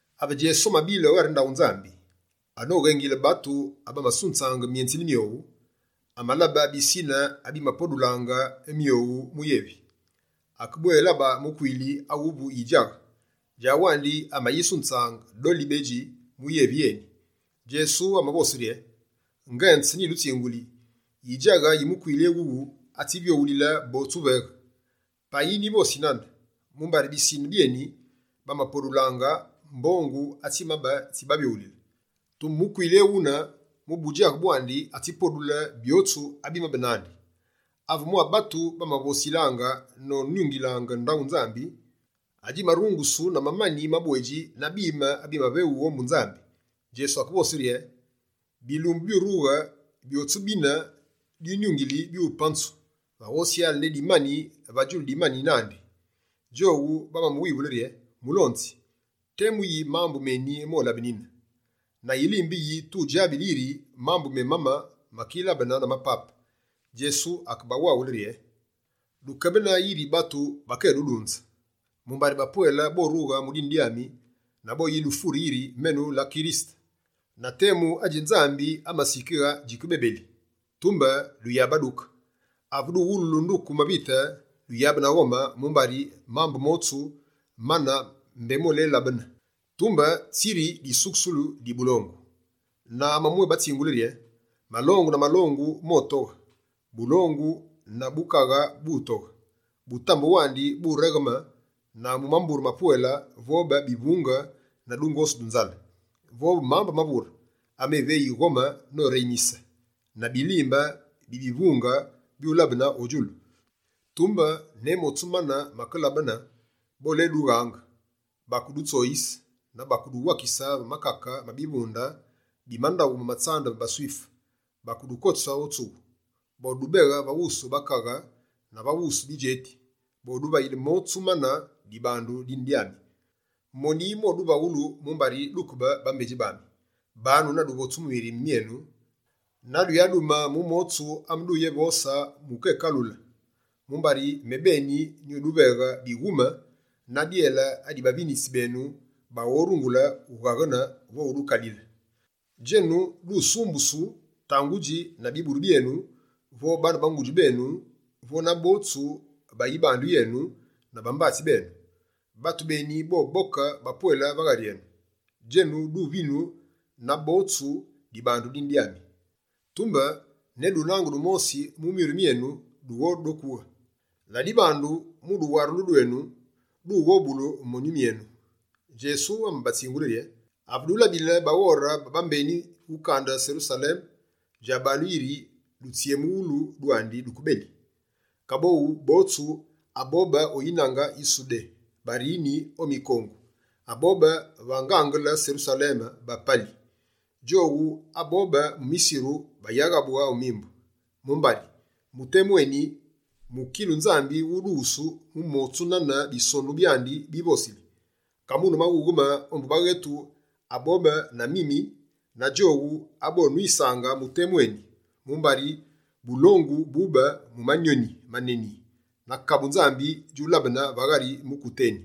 Ave Djesu amabile o ghari ndaghu Nzambi, anoghengile batu abamasunzaange myenzili myowu, amalabe bisine abimapodulaange myowu mu yevi. Akebwélabe mukwili awuvu yidjaghe, djawandi amayisunzange doli bedji mu yevi yeni. Djesu amavose rye: «Ngenze nyidutsinguli, yidjaghe yi mukwili éwuwu, atsivyoghulile botsu uveghe. Payi nyivosi nane, mumbari bisine byeni, bamapodulaange mbongu atsimabe tsibavyoghulile. Tumbe mukwili ewune, mu budjaghe bwandi, atsipodule byotsu abimabe nandi.» Ave mwa batu bamavosilaange nonyungile ndaghu Nzambi, adjimarungusu na mamani mabwedji na bime abimaveghungu ombu Nzambi, Djesu akevose rye: «Bilumbu byurughe, byotsu bine dwinyungili, byupanzu, va ghosyale ne dimani va djulu dimani nandi.» Djowu bamamuwivule rye: «Mulonzi, temu yi mambu meni molabenine? Na yilimbe yi, tudjabile yiri mambu memane makilabene na mapape?» Djesu akebawaghule rye: «Dukebene yiri batu bakedudunze. Mumbari bapwele borughe mu dine dyami na boyidufure yiri “Menu la Kirisete” na “Temu adji Nzambi amasikighe djikebebeli.” Tumbe duyabaduke. Ave duwululu nduku mavite, duyabe na ghome, mumbari mambu motsu mane mbé molelabene. Tumbe, tsi yiri disukusulu di bulongu.» Na amamwébatsingule rye: «Malongu na malongu motoghe; bulongu na bukaghe butoghe. Butambe wandi buregheme, na mu mambure mapwele, vobe bivunge na dungosu du nzale, vobe mambu mavure, ameveyi ghome noreyimise, na bilimbe bimuvingu byulabene o djulu. Tumbe, ne motsu mane makelabene, boledughaange, bakedutsoyise na boduwakise va makake ma bivunde bi mandaghu ma tsambu ma baSwife, bakedukotise o tsughu, bodubeghe va wusu bakaghe na va wusu bidjeti. Boduvayile motsu mane dibandu dine dyami. Moni moduvaghulu mumbari dukebe bambedji bami. Banu na duvotsu mu mirime myenu na duyadume mu motsu ameduyevose mu ukekaghule. Mumbari mebeni nyuduveghe bighume na dyele adi bavinitsi benu baghorungule ughaghene vo udukalile. Djenu, dusumbusu tangudji na biburu byenu, vo baane ba ngudji benu vo na botsu ba yibandu yenu na bambatsi benu. Batu beni boboke bapwele va ghari enu. Djenu, duvinu na botsu dibandu dine dyami. Tumbe ne dunange dumosi mu myuru myenu doghodokughe. Ladibandu, mu duwarulu dwenu, dughobule myonyu myenu.» Djesu amabatsingule rye: «Ave dulabile baghore ba bambeni ukande Serusaleme, djabanu yiri dutsyemughulu dwandi duke beli. Kaboghu, botsu abobe o yinange yi Sudé barini o mikongu, abobe va ngangele Serusaleme bapali. Djowu abobe mu misiru, bayaghabughe o mimbu. Mumbari, mu temu eni, mukilu Nzambi wudughusu mu motsu nane Bisonu byandi bivosili. Kamune maghughe-ma ombu baghetu abobe na mimi na djowu abonwisaange mu temu eni, mumbari bulongu bube mu manyoni maneni na kabu Nzambi djulabene va ghari mukute eni.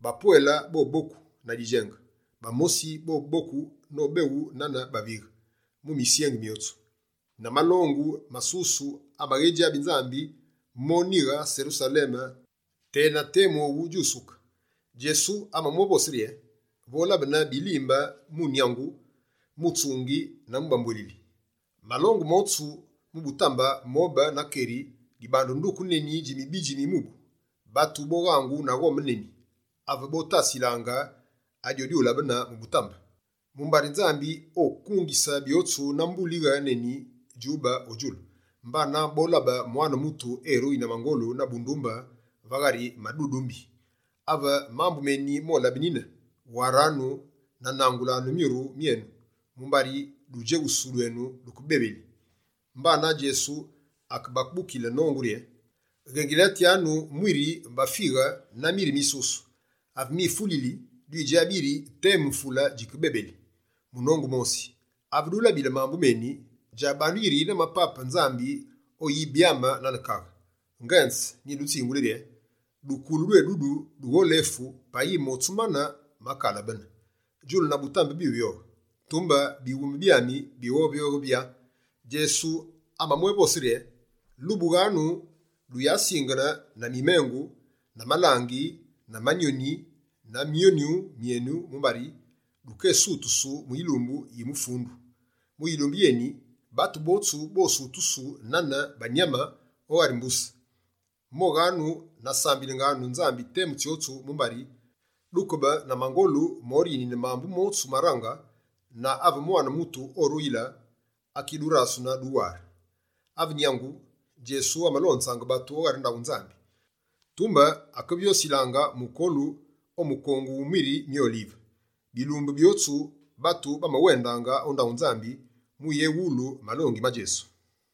Bapwele boboku na didjenge, bamosi bobongu nobeghu nane bavighe, mu misyengi myotsu. Na malongu masusu amaghedjabi Nzambi, monighe Serusaleme tena temu owu djusuke.» Djesu amamwévose rye: «Volabene bilimbe mu nyangu, mu tsungi na mu bambwelili. Malongu motsu, mu butambe mobe na keri dibandu nduku neni dji mibidji mi mubu. Batu boghangu na ghome neni, ave botasilaange adyodyulabene mu butambe, mumbari Nzambi okungise byotsu na mbulighe neni djube o djulu. Mbana, bolabe Mwane Mutu eruyi na mangolu na bundumbe va ghari madudumbi. Ave mambu meni molabenine, waranu na nangulanu myuru myenu, mumbari dudjeghusu dwenu duke bebeli.» Mbana Djesu akebabukile nongu rye: «Ghengilatyanu mwiri bafighe na miri misusu. Ave mifulili, dwidjabi yiri temu mvule djikebebeli. Munongu mosi, ave dulabile mambu meni, djabanu yiri na mapape Nzambi oyibyame nane kaghe. Ngenze, nyidutsinguli rye: dukulu dwedudu, dugholefu payi motsu mane, makalabene. Djulu na butambe byuvyoghe, tumbe bighume byami bighovyoghe “vyaa”.» Djesu amamwévose rye: «Lubughanu, duyasingene na mimengu, na malangi na manyoni ma myonyu myenu mumbari dukesutusu mu yilumbu yi mufundu. Mu yilumbu yeni, batu botsu bosutusu nane banyame o ghari mbuse. Moghanu na sambilenganu Nzambi temu tsyotsu mumbari, dukebe na mangolu morinine mambu motsu marange, na ave Mwane Mutu oruyile, akidurasunu duware.» Ave nyangu, Djesu amalonzaange batu o ghari ndaghu Nzambi. Tumbe, akevyosilaange mukolu o mukongu wu miri mi Olive. Bilumbu byotsu, batu bamawendaange o ndaghu Nzambi mu uyéwulu malongi ma Djesu.